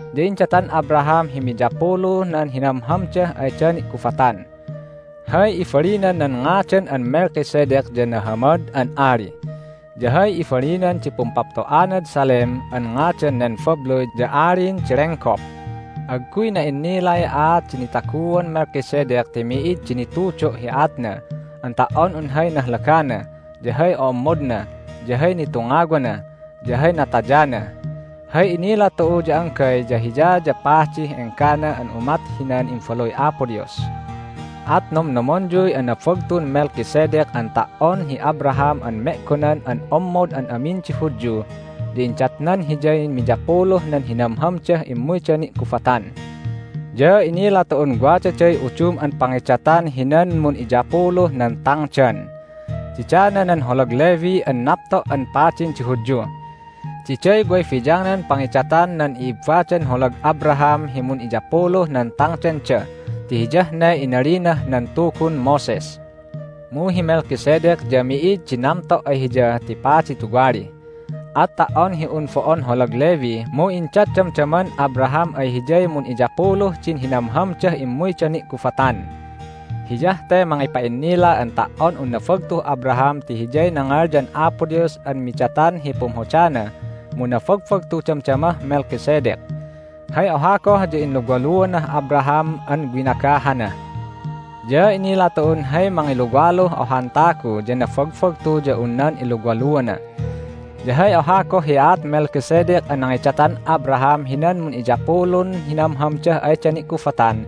Ya indatan Abraham hi miyapuluh nan hinamhamdah ayda ni'gubatan. Hay ibalinan nan ngadan an Melchizedek ya nahamad an ali. Ya hay ibalinan di pumpapto'anad Salem an ngadan nen babluy ya alin di lenggop. Agguy na'innilay aat di nitaguan Melchizedek ti mi'id di nitudo' hi aatna an ta"on un hay nahlagana, ya hay o'ommodna, ya hay nitungawana, ya hay natayana. Hay inila tu'u ya anggay ya hiya ya padih enggana an umat hinan Imbaluy Apo Dios. At nomnomonyuy anabagtun Melchizedek an ta"on hi Abraham an me'gonan an ommod an amin di Hudyu ya indatnan hiyay miyapuluh nan hinamhamdah immuyda ni'gubatan. Ya inila tu'un wadaday udum an pangidatan hinan mun'iyapuluh nan tangdan. Didana nan holag Levi an napto' an padin di Hudyu. Diday way biyangnan pangidatan nan i'ibbadan holag Abraham hi mun'iyapuluh nan tangdanda ti hiyah ne inalinah nan Tugun Moses. Mu hi Melchizedek ya mi'id di namto' ay hiya ti padi tuwali. At ta"on hi un bo'on holag Levi mu indat damdaman Abraham ay hiyay mun'iyapuluh din hinamhamdah immuyda ni'gubatan. Hiyah te mangipa'innila an ta"on un nabagtuh Abraham ti hiyay nangalyan Apo Dios an midatan hi pumhodana mu nabagbagtu damdamah Melchizedek. Hay oha goh ya inluwaluanah Abraham an winagahana. Ya inila tu'un hay mangiluwaluh ohan tagu ya nabagbagtu ya un nan iluwaluana. Ya hay oha goh hi aat Melchizedek an nangidatan Abraham hinan mun'iyapulun hinamhamdah ayda ni'gubatan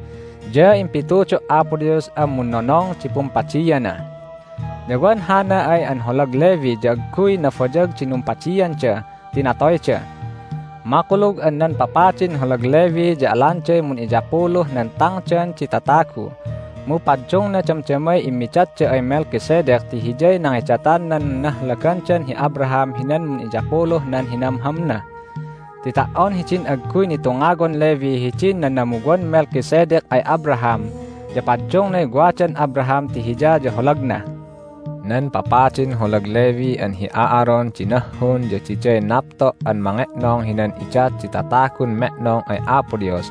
ya impitudo' Apo Dios an munnonong di pumpadiana. Ya wan hana ay an holag Levi ya agguy nabayag di numpadianda ti natoyda. Makulug an nan papadin holag Levi ya alanday mun'iyapuluh nan tangdan di tatagu, mu paddungna damdamay immidatda ay Melchizedek ti hiyay nangidatan nan nahlagandan hi Abraham hinan mun'iyapuluh nan hinamhamna. Ti ta"on hidin agguy nitungawan Levi hidin nanamuwan Melchizedek ay Abraham ya paddungnay wadan Abraham ti hiya ya holagna. Nan papadin holag Levi an hi Aaron di nahhun, ya diday napto' an mange'nong hinan idat di tatagun me'nong ay Apo Dios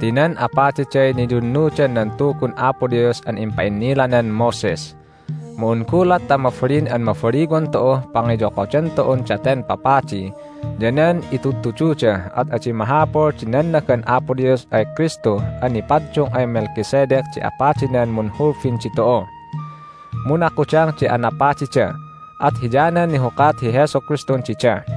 ti nan apadiday niyunnudan nan Tugun Apo Dios an impa'innilanan Moses. Mu un gulat ta mabalin an mabaliwan tu'uh pangiyokodan tu'un daten papadi ya nan itudtududa at adi mahapul di nannagan Apo Dios ay Kristu an nipaddung ay Melchizedek di apadinan munhulbin ditu'u. Mu nakudang di anapadida, at hiyanan nihukat hi Jesu Kristun dida.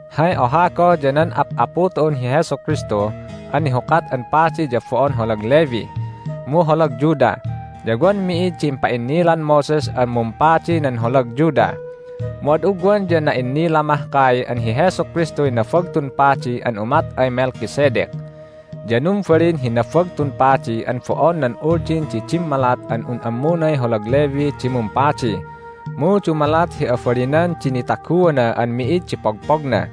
Hay oha goh ya nan Ap'apu tu'un hi Jesu Kristu an nihukat an padi ya bo'on holag Levi, mu holag Judah, ya wan mi'id di impa'innilan Moses an mumpadi nan holag Judah. Mu ad ugwan ya na'innila mahkay an hi Jesu Kristuy Nabagtun Padi an umat ay Melchizedek. Ya numbalin hi Nabagtun Padi an bo'on nan Uldin di dimmalat an un ammunay holag Levi di mumpadi, mu dumalat hi abalinan di nitaguana an mi'id di pogpogna.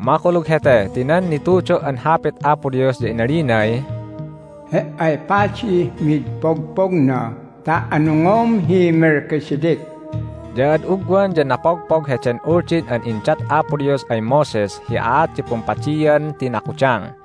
Makulug hete ti nan nitudo' an Hapit Apo Dios ya inalinay, "He"ay padih mid pogpogna ta anungom hi Melchizedek." Ya ad ugwan ya napogpog heden Uldin an indat Apo Dios ay Moses hi aat di pumpadian ti nakudang.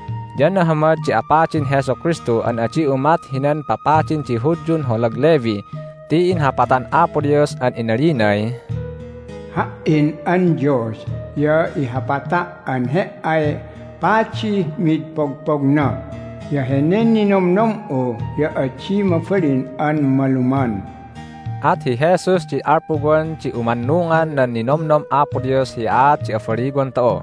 Ya nahamad di apadin Jesu Kristu an adi umat hinan papadin di Hudyun holag Levi ti inhapatan Apo Dios an inalinay, "Ha"in an Dios ya ihapata' an He"ay padih mid pogpogna, ya henen ninomnom'u ya adi mabalin an maluman." At hi Jesus di alpuwan di umannungan nan ninomnom Apo Dios hi aat di abaliwan tu'u.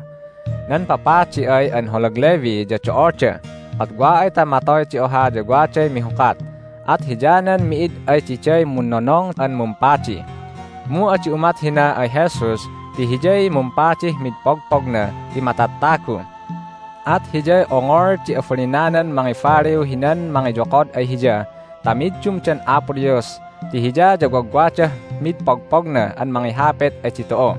Nan papadi ay an holag Levi ya do'olda, at wa ay ta matoy di oha ya waday mihukat, at hiyanan mi'id ay diday munnonong an mumpadi. Mu adi umat hina ay Jesus ti Hiyay mumpadih mid pogpogna ti matattagu. At Hiyay ongol di abalinanan mangibaliw hinan mangiyokod ay Hiya ta middumdan Apo Dios ti Hiya ya wagwadah mid pogpogna an mangihapit ay ditu'u.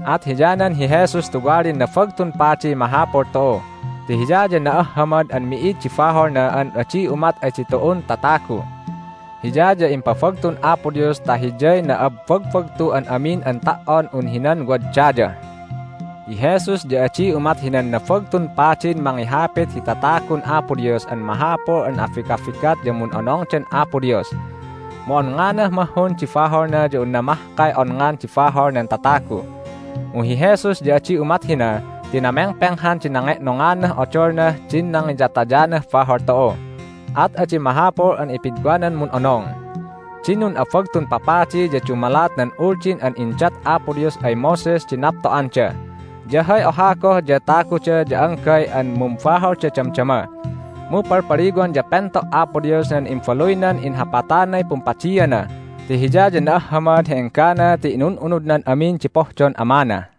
At hiyanan hi Jesus tuwalin Nabagtun Padiy mahapul tu'u! Ti Hiya ya na'ahhamad an mi'id di baholna an adi umat ay ditu'un tatagu. Hiya ya impabagtun Apo Dios ta Hiyay na'abbagbagtuh an amin an ta"on un hinan wad daya. Hi Jesus ya adi umat hinan Nabagtun Padin mangihapit hi tatagun Apo Dios an mahapul an abigabigat ya mun'onongdan Apo Dios, mu onnganah mahhun di baholna ya unna mahkay onngan di bahol nan tatagu. Mu hi Jesus ya adi umat hina ti namengpenghan di nange'nonganah odolnah din nangiyatayanah bahol tu'u. At adi mahapul an ipidwanan mun'onong. Din nun'abagtun papadi ya dumalat nan Uldin an indat Apo Dios ay Moses di napto'anda. Ya hay oha goh ya taguda ya anggay an mumbaholda damdama. Mu palpaliwan ya pento' Apo Dios nan Imbaluynan inhapatanay pumpadiana ti Hiya ya na'ahhamad hi enggana ti inun'unudnan amin di pohdon Amana.